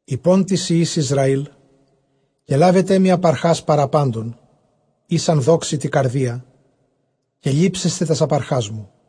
εἶπον τοῖς υἱοῖς Ἰσραὴλ, καὶ λάβετε ἀπαρχὰς παρὰ πάντων, οἷς ἂν δόξῃ τῇ καρδίᾳ, καὶ λήψεσθε τὰς ἀπαρχάς μου.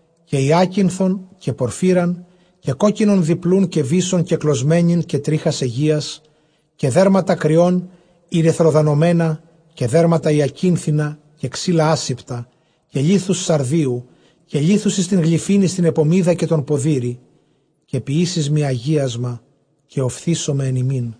καὶ ὑάκινθον, καὶ πορφύραν, καὶ κόκκινον διπλοῦν, καὶ βύσσον κεκλωσμένην, καὶ τρίχας αἰγείας, καὶ δέρματα κριῶν ἠρυθροδανωμένα, καὶ δέρματα ὑακίνθινα, καὶ ξύλα ἄσηπτα, καὶ λίθους Σαρδίου, καὶ λίθους εἰς τὴν γλυφὴν εἰς τὴν ἐπωμίδα, καὶ τὸν ποδήρη. Καὶ ποιήεις μοι ἁγίασμα, καὶ ὀφθήσομαι ἐν ὑμῖν.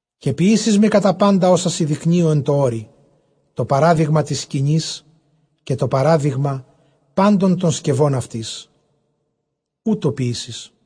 Καὶ ποιήσεις μοι κατὰ πάντα ὅσα σοι δεικνύω ἐν τῷ ὄρει, τὸ παράδειγμα τῆς σκηνῆς, καὶ τὸ παράδειγμα πάντων τῶν σκευῶν αὐτῆς· οὕτω ποιήσεις.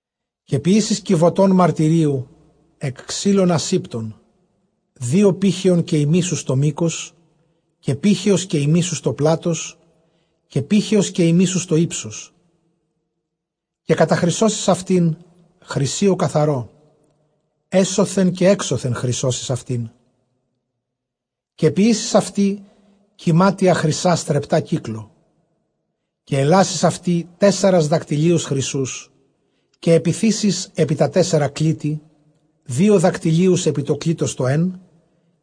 Καὶ ποιήσεις κιβωτὸν μαρτυρίου ἐκ ξύλων ἀσήπτων, δύο πήχεων καὶ ἡμίσους τὸ μῆκος, καὶ πήχεος καὶ ἡμίσους τὸ πλάτος, καὶ πήχεως καὶ ἡμίσους τὸ ὕψος. Καὶ καταχρυσώσεις αὐτὴν χρυσίῳ καθαρῷ, ἔσωθεν καὶ ἔξωθεν χρυσώσεις αὐτήν· καὶ ποιήσεις αὐτῇ κυμάτια χρυσᾶ στρεπτὰ κύκλῳ. Καὶ ἐλάσεις αὐτῇ τέσσαρας δακτυλίους χρυσοῦς, καὶ ἐπιθήσεις ἐπὶ τὰ τέσσαρα κλίτη· δύο δακτυλίους ἐπὶ τὸ κλίτος τὸ ἓν,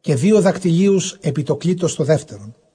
καὶ δύο δακτυλίους ἐπὶ τὸ κλίτος τὸ δεύτερον.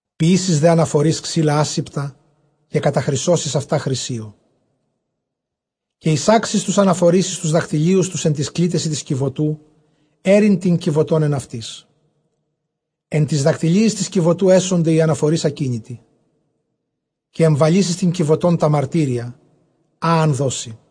Ποιήσεις δὲ ἀναφορεῖς ξύλα ἄσηπτα, καὶ καταχρυσώσεις αὐτὰ χρυσίῳ· Καὶ εἰσάξεις τοὺς ἀναφορεῖς εἰς τοὺς δακτυλίους τοὺς ἐν τοῖς κλίτεσι τῆς κιβωτοῦ, αἴρειν τὴν κιβωτὸν ἐν αὐτοῖς. Ἐν τοῖς δακτυλίοις τῆς κιβωτοῦ ἔσονται οἱ ἀναφορεῖς ἀκίνητοι. Καὶ ἐμβαλεῖς εἰς τὴν κιβωτὸν τὰ μαρτύρια, ἃ ἂν δῶ σοι.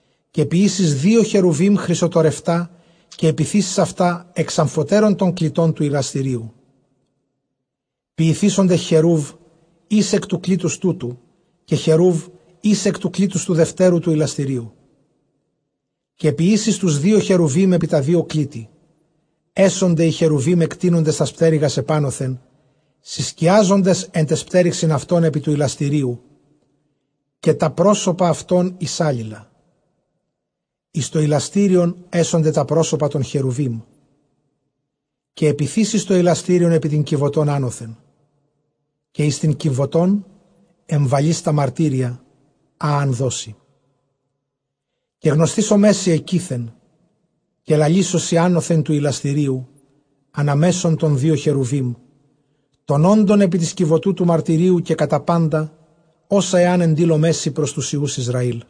Καὶ ποιήσεις δύο χερουβὶμ χρυσοτορευτὰ, καὶ ἐπιθήσεις αὐτὰ ἐξ ἀμφοτέρων τῶν κλιτῶν τοῦ ἱλαστηρίου. Ποιηθήσονται χεροὺβ εἷς ἐκ τοῦ κλίτους τούτου, καὶ χεροὺβ εἷς ἐκ τοῦ κλίτους τοῦ δευτέρου τοῦ ἱλαστηρίου· καὶ ποιήσεις τοὺς δύο χερουβὶμ ἐπὶ τὰ δύο κλίτη. Ἔσονται οἱ χερουβὶμ ἐκτείνοντες τὰς πτέρυγας ἐπάνωθεν, συσκιάζοντες ἐν ταῖς πτέρυξιν αὐτῶν ἐπὶ τοῦ ἱλαστηρίου, καὶ τὰ πρόσωπα αὐτῶν εἰς ἄλληλα, εἰς τὸ ἱλαστήριον ἔσονται τὰ πρόσωπα τῶν χερουβίμ. Καὶ ἐπιθήσεις τὸ ἱλαστήριον ἐπὶ τὴν κιβωτὸν ἄνωθεν, καὶ εἰς τὴν κιβωτὸν ἐμβαλεῖς τὰ μαρτύρια, ἃ ἂν δῶ σοι. Καὶ γνωσθήσομαί σοι ἐκεῖθεν, καὶ λαλήσω σοι ἄνωθεν τοῦ ἱλαστηρίου ἀνὰ μέσον τῶν δύο χερουβὶμ, τῶν ὄντων ἐπὶ τῆς κιβωτοῦ τοῦ μαρτυρίου, καὶ κατὰ πάντα ὅσα ἐὰν ἐντείλωμαί σοι πρὸς τοὺς υἱοὺς Ἰσραήλ.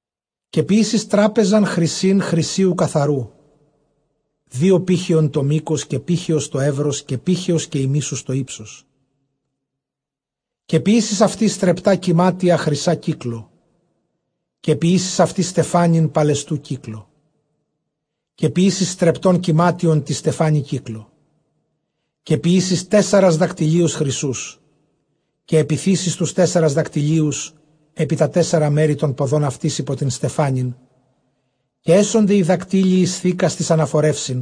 Καὶ ποιήσεις τράπεζαν χρυσῆν χρυσίου καθαροῦ, δύο πήχεων τὸ μῆκος, καὶ πήχεως τὸ εὖρος, καὶ πήχεως καὶ ἡμίσους τὸ ὕψος. Καὶ ποιήσεις αὐτῇ στρεπτὰ κυμάτια χρυσᾶ κύκλῳ· καὶ ποιήσεις αὐτῇ στεφάνην παλαιστοῦ κύκλῳ· Καὶ ποιήσεις στρεπτὸν κυμάτιον τῇ στεφάνῃ κύκλῳ. Καὶ ποιήσεις τέσσαρας δακτυλίους χρυσοῦς, καὶ ἐπιθήσεις τοὺς τέσσαρας δακτυλίους ἐπὶ τὰ τέσσαρα μέρη τῶν ποδῶν αὐτῆς ὑπὸ τὴν στεφάνην. Καὶ ἔσονται οἱ δακτύλιοι εἰς θήκας τοῖς ἀναφορεῦσιν,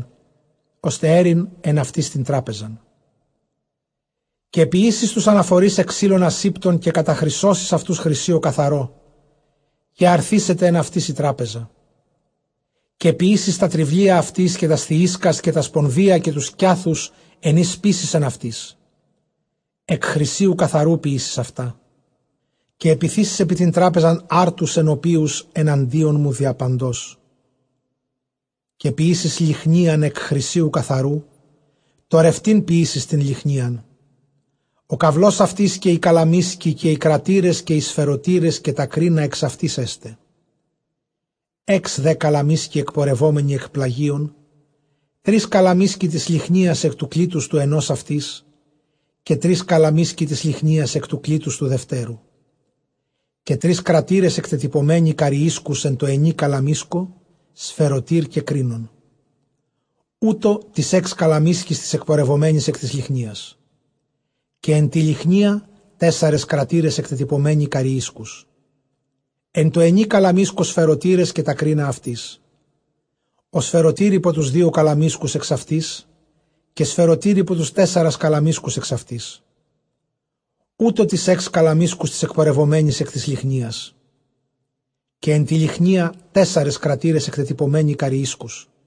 ὥστε αἴρειν ἐν αὐτοῖς τὴν τράπεζαν. Καὶ ποιήσεις τοὺς ἀναφορεῖς ἐκ ξύλων ἀσήπτων, καὶ καταχρυσώσεις αὐτοὺς χρυσίῳ καθαρῷ, καὶ ἀρθήσεται ἐν αὐτοῖς ἡ τράπεζα. Καὶ ποιήσεις τὰ τρυβλία αὐτῆς, καὶ τὰς θυΐσκας, καὶ τὰ σπονδεῖα, καὶ τοὺς κυάθους, ἐν οἷς σπείσεις ἐν αὐτοῖς, ἐκ χρυσίου καθαροῦ ποιήσεις αὐτά. Καὶ ἐπιθήσεις ἐπὶ τὴν τράπεζαν ἄρτους ἐνωπίους ἐναντίον μου διαπαντός. Καὶ ποιήσεις λυχνίαν ἐκ χρυσίου καθαροῦ, τορευτὴν ποιήσεις τὴν λυχνίαν· ὁ καυλὸς αὐτῆς, καὶ ὁ καλαμίσκοι, καὶ οἱ κρατῆρες, καὶ οἱ σφαιρωτῆρες, καὶ τὰ κρίνα ἐξ αὐτῆς ἔσται. Ἓξ δὲ καλαμίσκοι ἐκπορευόμενοι ἐκ πλαγίων, τρεῖς καλαμίσκοι τῆς λυχνίας ἐκ τοῦ κλίτους τοῦ ἑνὸς αὐτῆς, καὶ τρεῖς καλαμίσκοι τῆς λυχνίας ἐκ τοῦ κλίτους τοῦ δευτέρου. Καὶ τρεῖς κρατῆρες ἐκτετυπωμένοι καρυΐσκους· ἐν τῷ ἑνὶ καλαμίσκῳ σφαιρωτὴρ καὶ κρίνον· οὕτω τοῖς ἓξ καλαμίσκοις τοῖς ἐκπορευομένοις ἐκ τῆς λυχνίας. Καὶ ἐν τῇ λυχνίᾳ τέσσαρες κρατῆρες ἐκτετυπωμένοι καρυΐσκους· ἐν τῷ ἑνὶ καλαμίσκῳ σφαιρωτῆρες, καὶ τὰ κρίνα αὐτῆς. Ὁ σφαιρωτὴρ ὑπὸ τοὺς δύο καλαμίσκους ἐξ αὐτῆς· καὶ σφαιρωτὴρ ὑπὸ τοὺς τέσσαρας καλαμίσκους ἐξ αὐτῆς· οὕτω τοῖς ἓξ καλαμίσκοις τοῖς ἐκπορευομένοις ἐκ τῆς λυχνίας· καὶ ἐν τῇ λυχνίᾳ τέσσαρες κρατῆρες ἐκτετυπωμένοι καρυΐσκους.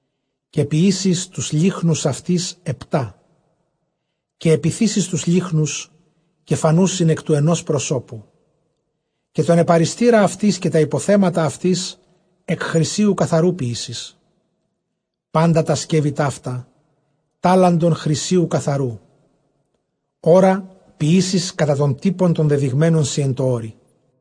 Καὶ ποιήσεις τοὺς λύχνους αὐτῆς ἑπτά· καὶ ἐπιθήσεις τοὺς λύχνους, καὶ φανοῦσιν ἐκ τοῦ ἑνὸς προσώπου. Καὶ τὸν ἐπαρυστῆρα αὐτῆς, καὶ τὰ ὑποθέματα αὐτῆς ἐκ χρυσίου καθαροῦ ποιήσεις. Πάντα τὰ σκεύη ταῦτα τάλαντον χρυσίου καθαροῦ. Ὅρα, ποιήσεις κατὰ τὸν τύπον τὸν δεδειγμένον σοι ἐν τῷ ὄρει.